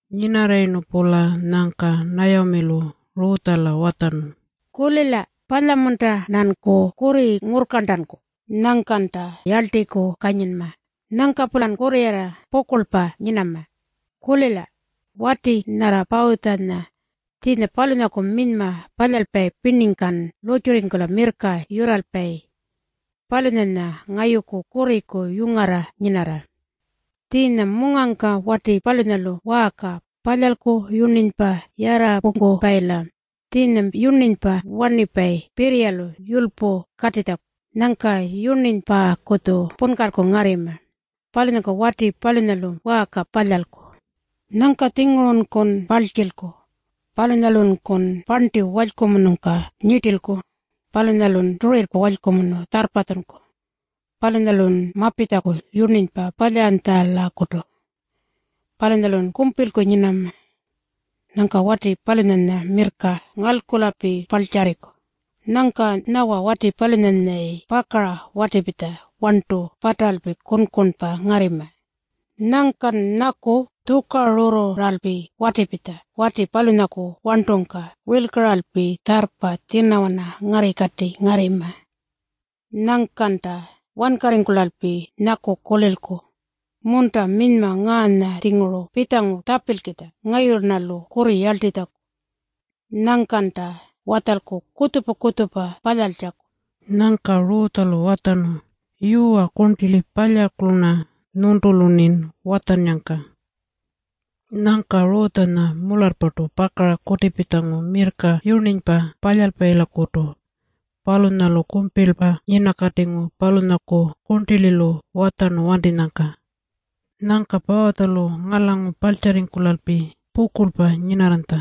Nyinarrayirnu-pula nyangka Nayamilu Rutjala watjarnu, “Kulila. Palya-munta-rnanku kurri ngurrkarntanku? Nyangkanta yarltiku kanyinma. Nyangka-pulan kurrirarra pukurlpa nyinama. Kulila. Wati nyarra Pawutjanya, tjiinya palunyaku minyma palyalpayi pirningkan lurrtjurringkula mirrka yurralpayi, palunyanya ngayuku kurriku yungarra nyinarra. Tjiinya mungangka wati palunyalu waarka palyalku yurninypa yararrapungkupayila. Tjiinya-ya yurninypa warnipayi pirriyalu yulypu katitjaku. Nyangka yurninypakutju punkalku ngarrima. Palunyangka wati palunyalu waarka palyalku. Nyangka-tjingurunkun parltjilku. Palunyalunkun parnti walykumunungka nyirtilku. Palunyalun turirrpa walykumunu tjarrpatjunku. Palunyalun mapitjaku yurninypa palyaranytjalakutu. Palunyalun kumpilku nyinama. Nyangka wati palunyanya mirrka ngalkulalpi parltjarriku. Nyangka nyawa wati palunyanyayi pakara watipitja warntu pataralpi kunkunpa ngarrima. Nyangkan nyaku tjukarurruralpi watipitja wati palunyaku warntungka wirlkaralpi tjarrpa tjinawana ngarrikati ngarrima. Nyangkanta wankarringkulalpi nyaku kulilku, ‘Munta, minyma ngaanya-tjinguru pitjangu tjapilkitja ngayulu-rnalu kurri yarltitjaku.’ Nyangkanta watjalku kutjupa-kutjupa palyaltjaku.” Nyangka Rutjalu watjarnu, “Yuwa kurntili, palyalku-rna nyuntulu-rnin watjannyangka.” Nyangka Rutjanya mularrpartu pakara kutipitjangu mirrka yurninypa palyaranytjalakutu. Palunyalu kumpilpa nyinakatingu palunyaku kurntililu watjarnu wantinyangka. Nyangka Pawutjalu ngalangu parltjarringkulalpi pukurlpa nyinarranytja.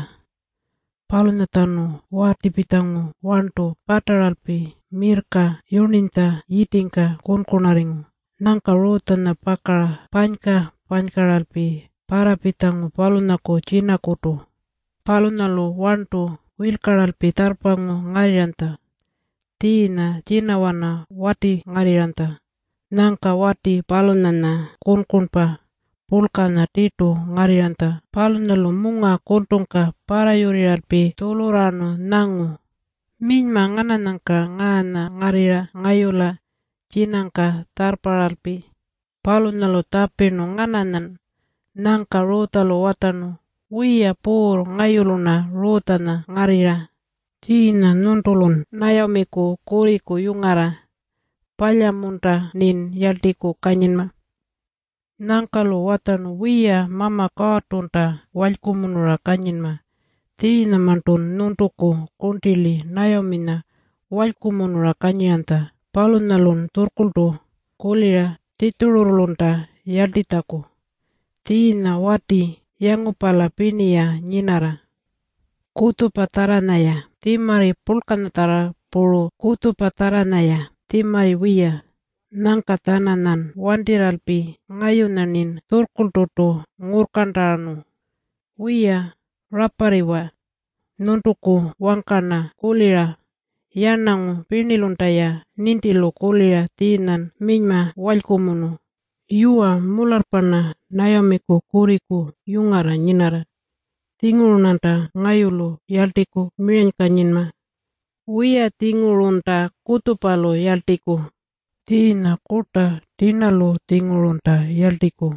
Palunyatjanu watipitjangu warntu pataralpi mirrka yurninytja yitingka kunkunarringu. Nyangka Rutjanya pakara panyka-panykaralpi parrapitjangu palunyaku tjinakutu. Palunyalu warntu wirlkaralpi tjarrpangu ngarrirranytja. Tjiinya tjinawana watingarrirranytja. Nyangka wati palunyanya kunkunpa purlkanya tirtu ngarrirranytja. Palunyalu munga kultungka parrayurrirralpi tjulurraarnu nyangu, “Minyma ngananyanyka ngaanya ngarrirra ngayula tjinangka tjarrparralpi?” Palunyalu tjapirnu, “Ngananyan?” Nyangka Rutjalu watjarnu, “Wiya puurr, ngayulu-rna Rutjanya ngarrirra. Tjiinya nyuntulun Nayamiku kurriku yungarra. Palya-munta-rnin yarltiku kanyinma?” Nyangka-lu watjarnu, “Wiya, Mama Kuurrtunta walykumunura kanyinma. Tjiinyamarntun nyuntuku kurntili Nayaminya walykumunura kanyiranytja. Palunyalun tjurrkurltu kulira Tjitjururrulunta yarltitjaku. Tjiinya wati yangupala pirni-ya nyinarra, kutjupatjarranya-ya tjimarri purlkanyatjarra puru kutjupatjarranya-ya tjimarri wiya. Nyangka-tjananyan wantirralpi ngayunya-rnin tjurrkurlturtu ngurrkarntanu. Wiya, raparriwa. Nyuntuku wangka-rna kulira. Yarnangu pirnilunta-ya nintilu kulira tjiinyan minyma walykumunu. Yuwa, mularrpa-rna Nayamiku kurriku yungarra nyinarra. Tjinguru-rnanta ngayulu yarltiku miranykanyinma. Wiya-tjingurunta kutjupalu yarltiku. Tjiinya kurta tirnalu-tjingurunta yarltiku.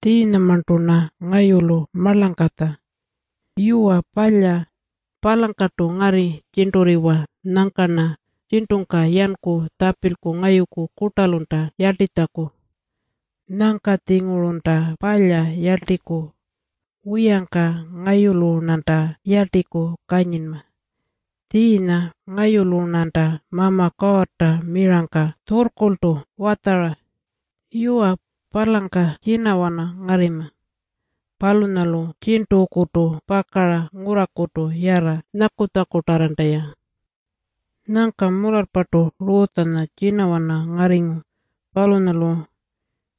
Tjiinyamarntu-rna ngayulu marlangkatja. Yuwa palya. Palangkartu ngarri tjirnturriwa. Nyangka-rna tjirntungka yanku tjapilku ngayuku kurtalunta yarltitjaku. Nyangka-tjingurunta palya yarltiku. Wiyangka ngayulu-rnanta yarltiku kanyinma. Tjiinya ngayulu-rnanta Mama Kuurrta mirangka tjurrkurltu watjara. Yuwa, palangka tjinawana ngarrima. Palunyalu tjirntukutu pakara ngurrakutu yarra nyakutjakutarranta-ya.” Nyangka mularrpartu Rutjanya tjinawana ngarringu, palunyalu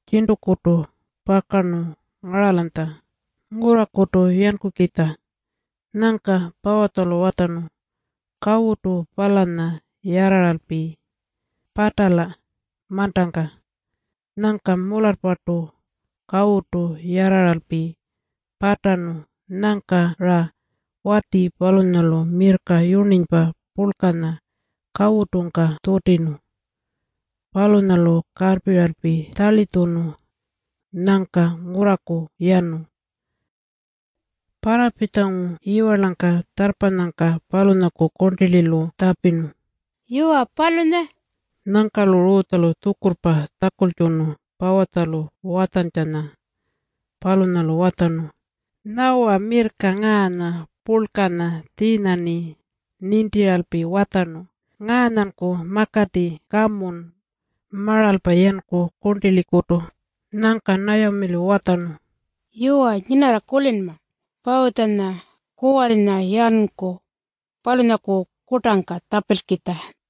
tjirntukutu pakarnu ngaralanytja ngurrakutu yankukitja. Nyangka Pawutjalu watjarnu, “Kawutu palanya yarraralpi patala mantangka.” Nyangka mularrpartu kawutu yarraralpi patarnu. Nyangka-ra wati palunyalu mirrka yurninypa purlkanya kawutungka tjutirnu. Palunyalu karrpiralpi tjarlitjunu. Nyangka ngurraku yanu. Parrapitjangu yiwarlangka tjarrpanyangka palunyaku kurntililu tjapirnu, “Yuwa, palunya?” Nyangka-lu Rutjalu tjukurrpa tjakultjunu Pawutjalu watjantjanya. Palunyalu watjarnu, “Nyawa mirrka ngaanya purlkanya. Tjiinya-rni nintiralpi watjarnu, ‘Ngaanyanku makati. Kamun maralpa yanku kurntilikutu.’” Nyangka Nayamilu watjarnu, “Yuwa, nyinarra kulinma. Pawutjanya kuwarrinya yanku palunyaku kurtangka tjapilkitja.”